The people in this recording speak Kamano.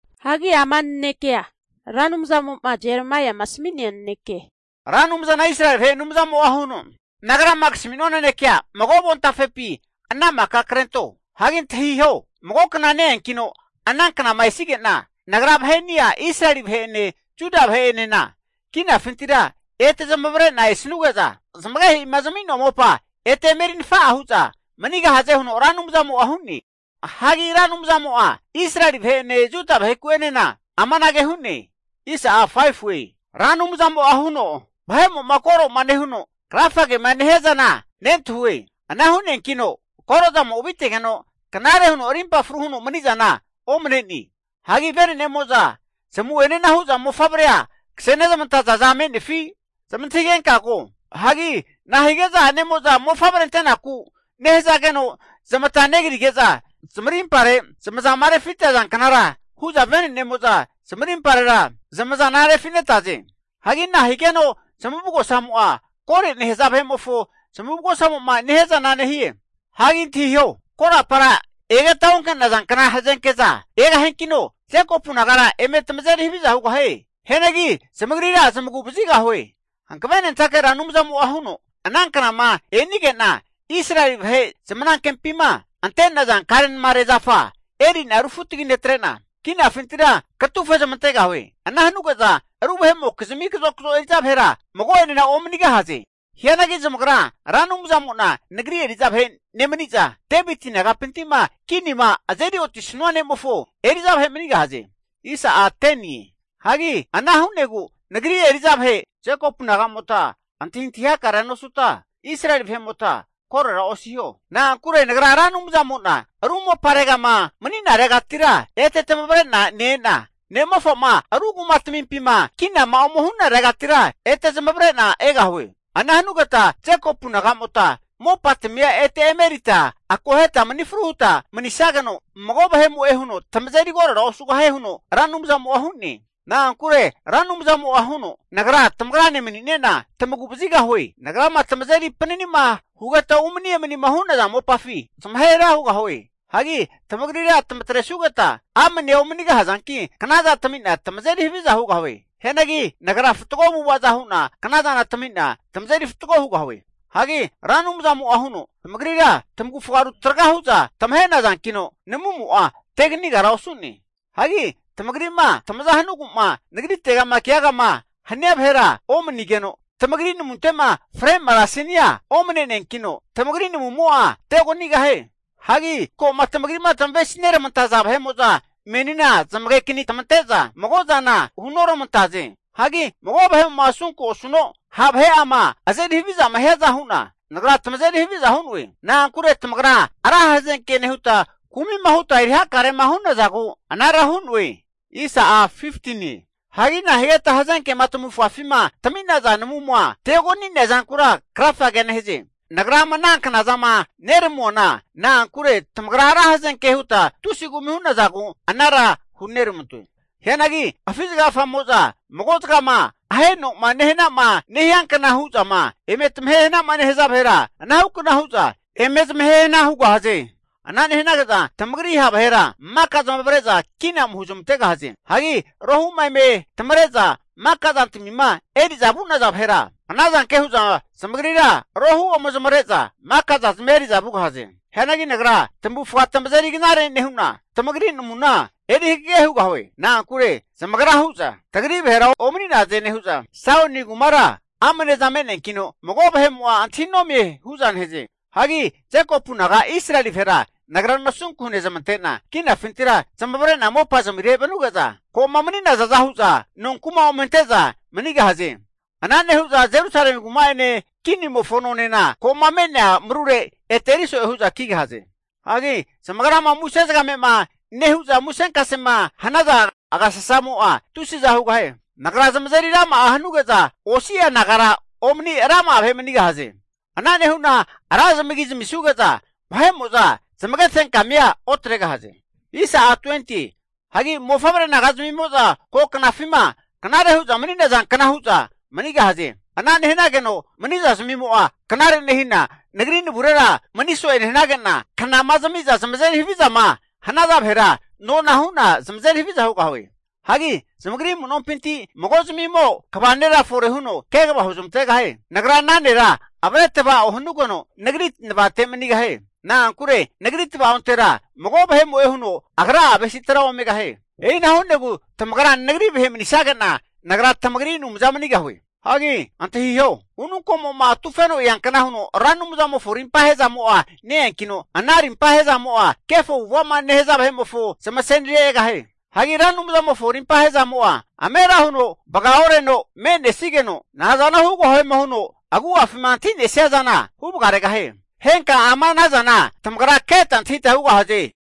Hagi ama nanekea Ra Anumzamo'ma Jeremaiama asami'nea naneke. Ra Anumzana Israeli vahe Anumzamo'a huno, Nagrama kasamua nanekea mago avontafepi ana maka krento. Hagi antahiho! Mago kna ne-eankino ana knama esige'na, Nagra vaheni'a Israeli vahe'ene Juda vahe'enena kinafintira ete zamavare'na esanuge'za zamagehe'ima zami'noa mopa ete eme eri nafa'a hu'za manigahaze huno Ra Anumzamo'a hu'ne. Hagi Ra Anumzamo'a Israeli vahe'ene Juda vaheku'enena amanage hu'ne. Ra Anumzamo'a huno, Vahe'mo'ma koro'ma nehuno krafagema nehia zana nentahue. Ana hu'neankino koro'zamo avitegeno, knare huno arimpa fru huno mani'zana omane'ne. Hagi vene'nemo'za zamu'enea hu'za mofavrea kasenezamataza za me'nefi zmantahigenka ko? Hagi nahige'za a'nemo'za mofavre ante'naku nehazageno, zamata negrige'za zamarimpare zamazama refita zanknara hu'za venenemo'za zamarimparera zamazana refinetaze? Hagi nahigeno zamavugosamo'a, kore nehaza vahe'mofo zamavugosamo'ma nehiazana nehie? Hagi antahiho, korapara egeta onke'naza kna hazenkeza egahiankino Jekopu nagara eme tamazeri haviza hugahie. Hianagi zamagrira zamagu vazigahue. Hankavenentake Ra Anumzamo'a huno, ana knama e'nige'na Israeli vahe zamanankempima ante'naza karenamare zafa eri'na rufutagi netre'na kinafintira katufe zamantegahue. Ana hanuge'za ru vahe'mokizmi kazokazo eri'za vahera mago'enena omanigahaze. Hianagi zamagra Ra Anumzamo'na Nagri eri'za vahe nemani'za, Deviti nagapinti'ma kinima azeri otisanua ne'mofo eri'za vahe manigahaze. Hagi ana hu'negu Nagri eri'za vahe Jekopu naga'mota antahintahi hakarea nosuta, Israeli vahe'mota korora osiho. Na'ankure Nagra Ra Anumzamo'na ru moparegama mani'naregatira, ete tamavre'na ne-ena, ne'mofa'ma ru kuma tamimpima kinama ome hu'naregatira ete zamavare'na egahue. Ana hanugeta Jekopu nagamota mopatamia ete eme erita akoheta mani fruhuta manisageno, mago vahemo'e huno tamazeri korora osugahie, huno Ra Anumzamo'a hu'ne. Na'ankure Ra Anumzamo'a huno, Nagra tamagrane manine'na tamagu vazigahue. Nagrama tamazeri panani'ma hugeta umani emanima hu'naza mopafi vahera zamahe hana hugahue. Hagi tamagrira tamatresugeta amnea omanigahazanki, knaza tami'na tamazeri haviza hugahue. Hianagi Nagra fatgo avu'avaza hu'na knazana tamina tamazeri fatgo hugahue. Hagi Ra Anumzamo'a huno, Tamagrira tamavufga rutraga hu'za tamahe nazankino namumo'a teganigara osu'ne. Hagi tamagri'ma tamaza hanugu'ma Nagritegama keagama hania vahera omanigeno, tamagrira namunte'ma fre marasinia omane'neankino, tamagri namumo'a teoganigahie. Hagi ko'ma tamagri'ma tamavesineramantaza vahe'mo'za menina zamagekani tamante'za, mago'a zana hunoramantaze. Hagi mago vahe'mo'ma asunku'ma osuno, ha' vahe'ama azeri havizama hiaza hu'na Nagra tamazeri haviza hu'noe. Na'ankure tamagra ra hazenke nehuta kumi'ma huta eri hakarema hu'nazagu anara hu'noe. Hagi nahigeta hazenkema tamavufafima tami'naza namuma teogania zankura krafagea nehaze? Nagra ama ana knazama neramuana, na'ankure tamagra ra hazenke huta tusi kumi hu'nazagu anara huneramantoe. Hianagi afi zagagafamo'za mago'zagama aheno'ma nehanama nehiankna hu'zama eme tamahe hana'ma nehaza vahera, anahukna hu'za eme zamahe hana hugahaze. Ana nehanage'za tamagri ha' vahera maka zamavare'za kina ome huzmantegahaze. Hagi rohu'ma eme tamare'za maka zantamima eri'zama vu'naza vahera, ana zanke hu'za zamagrira rohu ome zamare'za maka zazamia eri'za vugahaze. Hianagi Nagra tamavufga tamazeri knare nehu'na, tamagri namuna eri hagege hugahue. Na'ankure zamagra hu'za tagri vahera omani'naze nehu'za, Saioni kumara amneza me'neankino mago vahe'mo'a antahi nomie hu'za nehaze. Hagi Jekopu naga Israeli vahera Nagra nasunku hunezamante'na, kinafintira zamavare'na mopazamire vanuge'za, ko'ma mani'nazaza hu'za nonku'ma ome ante'za manigahaze. Ana nehu'za Jerusalemi kuma'ene kinimofo nonena, ko'ma me'nea marurera ete eriso'e hu'za kigahaze. Hagi zamagrama muse zagame'ma nehu'za musenkasema hanaza agasasamo'a tusiza hugahie. Nagra zamazeri rama'a hanuge'za, osi'a nagara omani rama'a vahe manigahaze. Ana nehu'na ra zamagi zamisuge'za, vahe'mo'za zamage fenkamia otregahaze. Hagi mofavre naga'zamimo'za ko knafima knare hu'za mani'nazankna hu'za manigahaze. Ana nehanageno mani'zazmimo'a knare nehina Nagri navurera mani so'e nehanage'na, knama zami'za zamazeri havizama hanaza vahera, nona hu'na zamazeri haviza hugahue. Hagi zamagri amu'nompinti mago'zmimo kva nera fore huno kegava huzmantegahie. Nagra ana nera avre tava'o hanugeno Nagri navate manigahie. Na'ankure Nagri tava'ontera mago vahemo'e huno agra'a avesitera omegahie. E'ina hu'negu tamagra Nagri vahe manisage'na, Nagra tamagri Anumza manigahue. Hagi antahiho! Ununkomo'ma atufeno eankna huno Ra Anumzamofo arimpahe zamo'a ne-eankino, ana rimpa ahezamo'a kefo avu'ava'ma nehaza vahe'mofo zamasenire egahie. Hagi Ra Anumzamofo arimpa ahe'zamo'a amera huno vagaoreno me'nesigeno, nazano hugahuema huno agu'afima antahi'nesia zana huvagaregahie. Henka ama ana zana tamagra keta antahita hugahaze.